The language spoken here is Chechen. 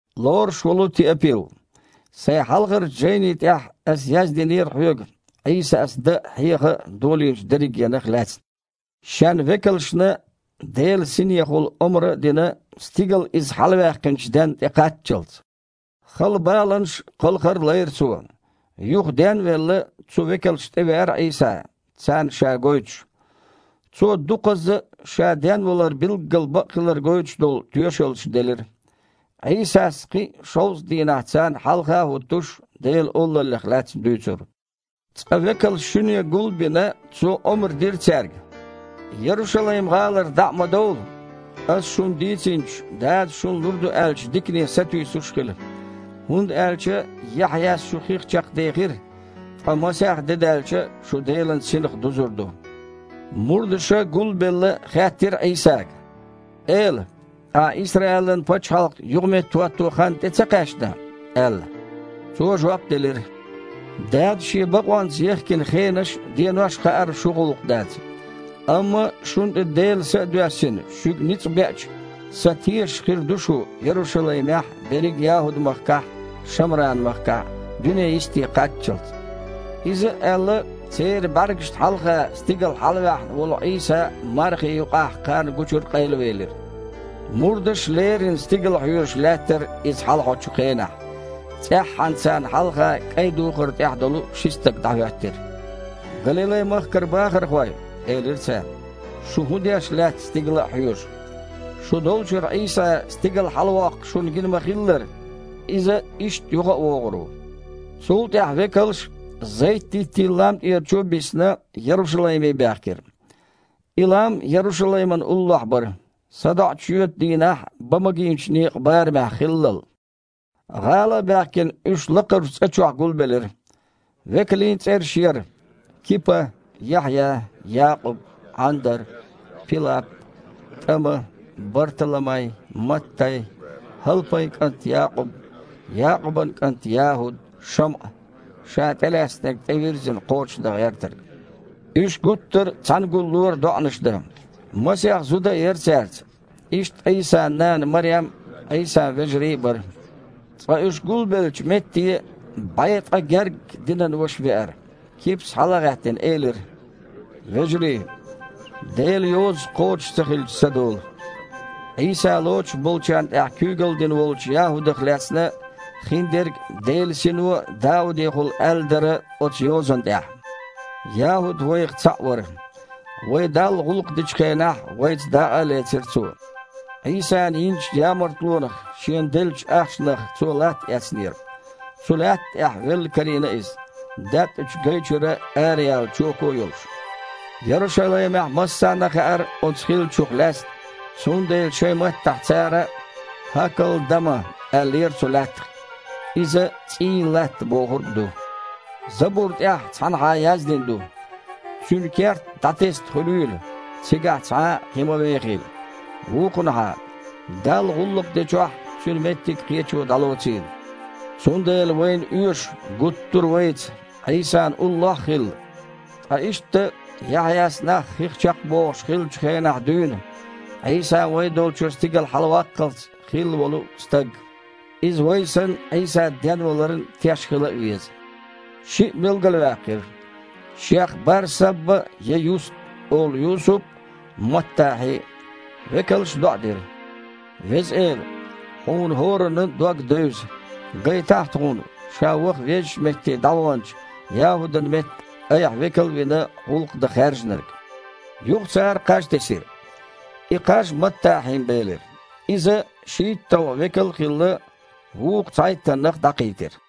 Лоруш волу Теапил, сайн хьалхарчу жайни тІехь ас яздинера хьоьга Іийсас дан а, хьеха а долийначу дерригенах а лаьцна, Шен векалшна Делан Синехула омра а дина, стигала Иза хьалаваьккхинчу денна тІекхаччалц. Хала баланаш а, кхалхар а лайра Цо. Юха, ден а велла, цу векалшна тІевеара Іийса, царна Ша гойтуш. Цо дукхазза а Ша денвалар билгал бакъ хилар гойтуш долу тоьшаллаш делира. Іийсас, кхин а шовзткъа дийнахь царна хьалха а хІуттуш, Делан Олаллех лаьцна дуьйцура. Цкъа, векалш шуьне гул а бина, Цо омра дира цаьрга: «Ярушалайм-гІалара дІа а ма довла, Аса шуна дийцинчу, Дадас шуна лур ду аьллачу дикане сатуьйсуш а хила. ХІунда аьлча Яхьъяс шу хих чекхдехира, ткъа масех де даьлча, шу Делан Синах дузур ду». Мурдаша, гул а белла, хаьттира Іийсага: «Эла, Ахьа Исраилан пачхьалкх юха меттахІоттайо хан тІе ца кхаьчна?» – аьлла. Цо жоп делира: «Дадас Шен бакъонца ехкина хенаш а, денош а хаар шун гІуллакх дац. Амма шуна тІе Делан Са а доьссина, шуьга ницкъ беача, Сан тешаш хир ду шу Ярушалаймехь а, берриг ЯхІуд-махкахь а, Шамранан махкахь а, дуьненан йисте кхаччалц а». Иза а аьлла, церан бІаьргашна хьалха стигала хьалаваьхьна волу Іийса мархи юкъахь къайлавелира. Мурдаш леррина стигала хьоьжуш лаьттара Иза хьалахьочу хенахь. ЦІеххьана царна юххехь кІайн духар а дуьйхина ши стаг дІахІоьттира. «Галилай-мехкан бахархой, – элира цара, – шу хІун деш лаьтта, стигала а хьоьжуш? Шу долчуьра Іийса стигала хьалавоккхуш шуна гина ма-хиллара, Иза иштта юхавогІур ву». Цул тІаьхьа векалш, Зайт-диттийн лам тІера чу а биссина, Ярушалайме баьхкира. И лам Ярушалаймана уллохь бара, садоІучу шоьтан дийнахь бан магийначу некъан барамехь хиллал. ГІала а баьхкина, уьш лакхарчу цІа чохь гулбелира. Векалийн цІераш яра: Кипа, Яхьъя, Якъуб, Іандар, Пилап, ТІама, Барталамай, Маттай, ХІалпайн кІант Якъуб, Якъубан кІант ЯхІуд, ШамІа, ша тІелаьцнарг тІевирззина кхочуш дан гІертарг. Уьш гуттар а цхьаьна гуллора доІанаш дан. Масех зуда а яра цаьрца, иштта Іийсан нана Марем а, Іийсан вежарий а бара. Цкъа уьш гулбеллачу метте бІе ткъа гергга динан ваша веара. Кипас, хьала а гІаьттина, элира: «Вежарий! Делан Йоза кхочуш ца хилча ца долу. Іийса лоцуш болчарна тІехь куьйгалла дина волчу ЯхІудах лаьцна хиндерг Делан Сино Даудехула аьлла дара оцу Йозан тІехь. ЯхІуд вайх цхьаъ вара, вай Далла гІуллакх дечу хенахь вайца дакъа а лецира цо». Іийсана йинчу ямартлонах шена деллачу ахчанах цо латта эцнера. Цу лаьтта тІехь велла карийна иза, даьттІачу гай чуьра араяьлла чоко а йолуш. Ярушалаймехь массарна а хаьара оцу хиллачух лаьцна, цундела шайн маттахь цара «ХІакал-дама» аьллера цу лаьттах. Иза «ЦІийн латта» бохург ду. « Забур тІехь цхьанхьа яздина ду: „Цуьнан керт дІатесна хуьлийла, цигахь цхьа а кхин ма вехийла“, вукхунхьа: „Далла гІуллакх дечохь цуьнан меттиг кхечо дІалоцийла“. Цундела вайна оьшу гуттар а вайца Іийсана уллохь а хилла, ткъа иштта Яхьъяс нах хих чекхбохуш хиллачул хенахь дуьйна, Іийса вай долчуьра стигала хьалаваккхалц хилла волу стаг. Иза, вай санна, Іийса денваларан теш хила а веза». Шиъ билгалваьккхира: шех Бар-Сабба я «Юст» олу Юсуп а, Маттахьи а. Векалша доІа дира: «Веза Эла! Хьуна хІораннан а дог девза, гайтахьа тхуна ша ваха веззачу метте дІаваханчу ЯхІудан метта, Айхьа векал а вина, гІуллакх дан хаьржинарг». Юха цара кхаж тесира. И кхаж Маттахьин бēлира. Иза, шийтталгІа векал а хилла, вукху цхьайттаннах дІакхийтира.